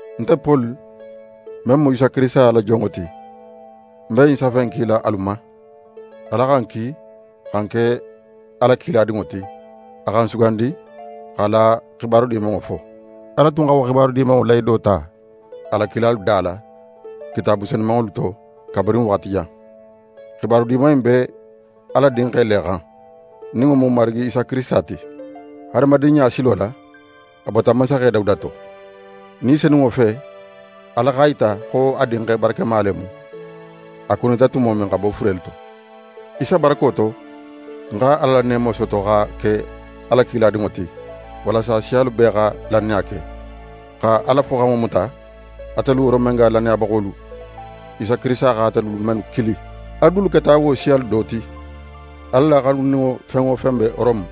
Nte Poli, men mu Isa Kirisita la jonŋo ti, ń be ɲin safe in kila alu ma. Ala xa ń kili xa ń ke a la kiladinŋo ti. A xa ń sugandi x'a la xibaru Dimanŋo fo. Ala tun xa wo Xibaru Dimanŋo lahido ta a la kilalu da la, Kitaabu senumanŋolu to kabirin waxati jan. Xibaru Diman in be Ala Dinxe le xan, nin wo mu n Marigi Isa Kirisita ti: Hadamadinɲa silo la, a bota mansaxe Dawuda to. Ni Senunŋo fe, Ala x'a yita xo a Dinxe barakema le mu, a kunita tumo men xa bo furelu to. Isa barako to, ń xa Ala la neemo soto xa ke a la kiladinŋo ti, walasa siyalu bee xa lannaya ke, xa Ala foxanŋo muta. Atelu Romenga lannayabaxolu, Isa Kirisita xa atelu mennu kili, alu dulu keta wo siyalu do ti. Ala la xanuninŋo fen wo fen be Rome,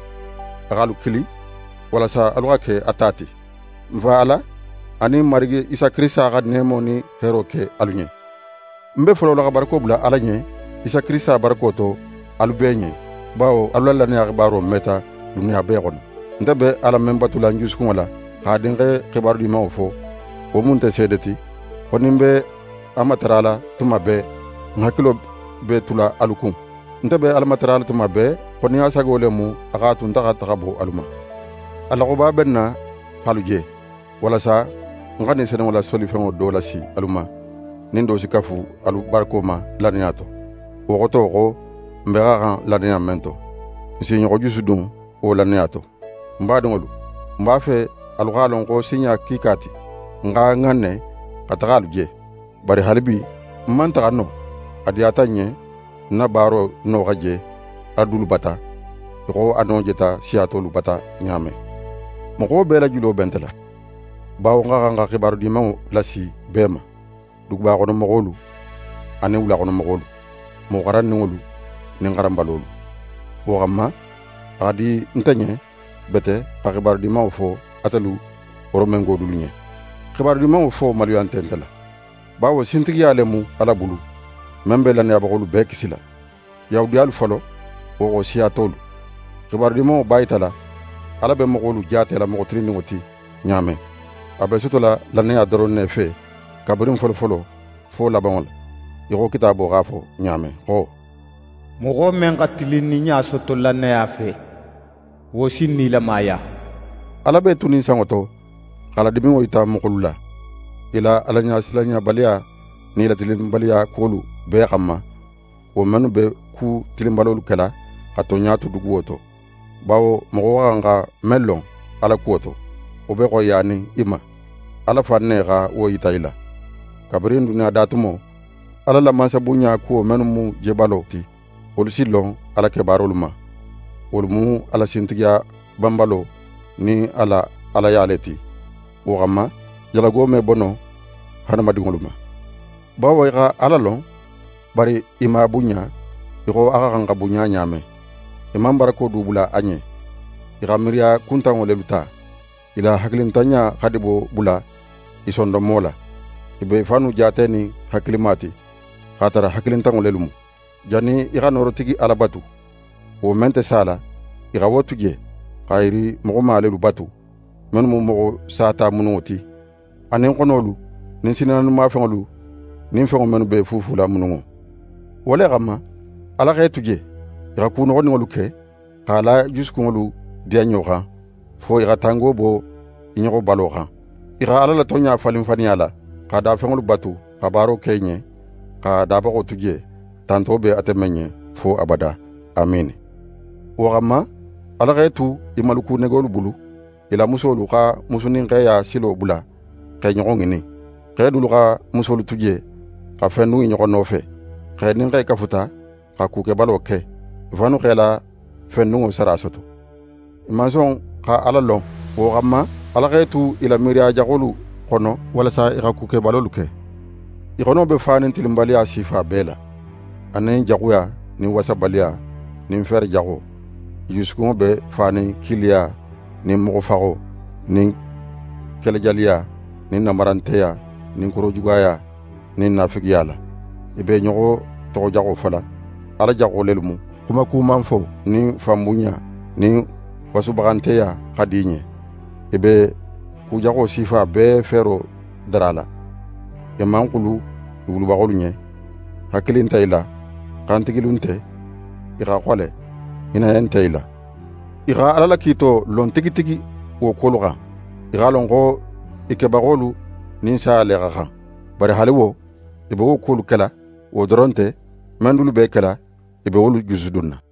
a x'alu kili walasa alu xa ke a ta ti. N Fa Ala, anin Marigi Isa Kirisita xa neemo nin heero ke alu ɲen. Ń be folola xa barako bula Ala ɲen Isa Kirisita barako to alu bee ɲen, bawo alu la lannaya xibaro meta duniya bee xono. Nte be Ala men batula ń jusukunŋo la, x'a Dinxe xibaru Dimanŋo fo, wo mu nte seede ti, xo nin ń b'a matarala tuma bee, ń hakilo be tula alu kun. Nte be Ala tarala tuma bee, xo nin a sago le mu, a x'a tu nte xa taxa bo alu ma. A loxoba be ń na x'alu je, walasa ń xa Ni Senunŋo la solifenŋo do lasi alu ma, nin do si kafu alu barako ma lannaya to. Wo xoto xo n bee xa xan lannaya men to, n s'i ɲoxo jusudun wo lannaya to. Ń badinŋolu, ń b'a fe alu x'a lon xo sinɲa kiika ti, ń x'a ŋanne xa taxa alu je, bari haalibi, ń man taxa no. A diyata ń ɲen ń na baaro no xa je alu dulu bata, í xo a no jeta siya tolu bata ɲa men. Moxo bee la julo be nte la, bawo ń xa xan xa Xibaru Dimanŋo lasi bee ma: Dugubaxono moxolu anin wulaxono moxolu, moxo xaranninŋolu nin xaranbalolu. Wo xanma, a xa di nte ɲen bete xa Xibaru Dimanŋo fo atelu Romengo dulu ɲen. xibaru Dimanŋo fo maluya nte nte la, bawo sintigiya le mu Ala bulu, men be lannayabaxolu bee kisila; Yahudiyalu folo, wo xo siya tolu. Xibaru Dimanŋo b'a yitala Ala be moxolu jaatela moxo tilinninŋo ti ɲa men. A be sotola lannaya doron ne fe kabirin folofolo fo labanŋo la, í xo Kitaabo x'a fo ɲa men xo: «Moxo men xa tilinninɲa soto lannaya fe, wo si nilamaya.» Ala b'é tunin sanŋo to x'a la diminŋo yita moxolu la, i la Alaɲasilanɲabaliya nin i la tilinbaliyakuwolu bee xanma, wo mennu be ku tilinbalolu kela xa tonɲa tu duguwo to. Bawo moxo xa xan xa men lon Ala kuwo to, wo be xoyiyanin i ma. Ala fan ne xa wo yita i la. Kabirin duniya da tumo, Ala la mansabunɲa kuwo mennu mu jebalo, wolu si lon a la kebaarolu ma. Wolu mu a la sintigiya banbalo nin a la Alaya le ti. Wo xanma, jalago me bo no hadamadinŋolu ma. Bawo i xa Ala lon, bari i man a bunɲa í xo a xa xan xa bunɲa ɲa men. I man barako du bula a ɲen. I xa miiriya kuntanŋo lelu ta. I la hakilintanɲa xa dibo bula i sondonmo la. I be i fannu jaatenin hakilima ti, x'a tara hakilintanŋo lelu mu. Jannin i xa Noorotigi Ala batu, wo men nte sala, i xa wo tu je, xa yiri moxoma lelu batu, mennu mu moxo sata mununŋo ti, anin xonolu nin sinnaanimafenŋolu nin fenŋo mennu b'e fuufula mununŋo. Wo le xanma, Ala x'e tu je, i xa ku noxoninŋolu ke, x'a la i jusukunŋolu diyanɲo xan, fo i xa tango bo i ɲoxo balo xan. I xa Ala la tonɲa falin faniya la, xa dafenŋolu batu xa baaro ke i ɲen, xa Dabaxo tu je, tanto be ate men ɲen fo abada. Amiini! Wo xanma, Ala x'e tu i maluku negolu bulu. I la musolu xa musu nin xeya silo bula x'e ɲoxo ŋinin. Xe dulu xa musolu tu je xa fendun i ɲoxo nofe. Xe nin xe kafuta xa kukebalo ke. I fannu x'e la fendunŋo sara soto. I man son xa Ala lon. Wo xanma Ala x'e tu i la miiriya jaxolu xono walasa i xa ku kebalolu ke. I xono be fanin tilinbaliya sifa bee la, anin jaxuya nin wasabaliya, nin feere jaxo. I jusukunŋo be fanin kiiliya nin moxofaxo nin kelejaliya nin nanbaranteya nin korojugaya nin naafigiya la. I be i ɲoxo toxojaxo fola. Ala jaxo lelu mu. Xumakumanfo nin fanbunɲa nin wasubaxanteya xa di i ɲen. I be ku jaxo sifa bee feero darala. I man xulu i wulubaxolu ɲen. Hakili nte i la, xantigilu nte, i xa xole, hinnaye nte i la. I xa Ala la kiito lon tigi tigi wo kuwolu xan. I x'a lon xo i kebaxolu nin saya le xa xan. Bari haali wo, i be wo kuwolu kela. Wo doron nte, men dulu b'e kela i be wolu jusudunna.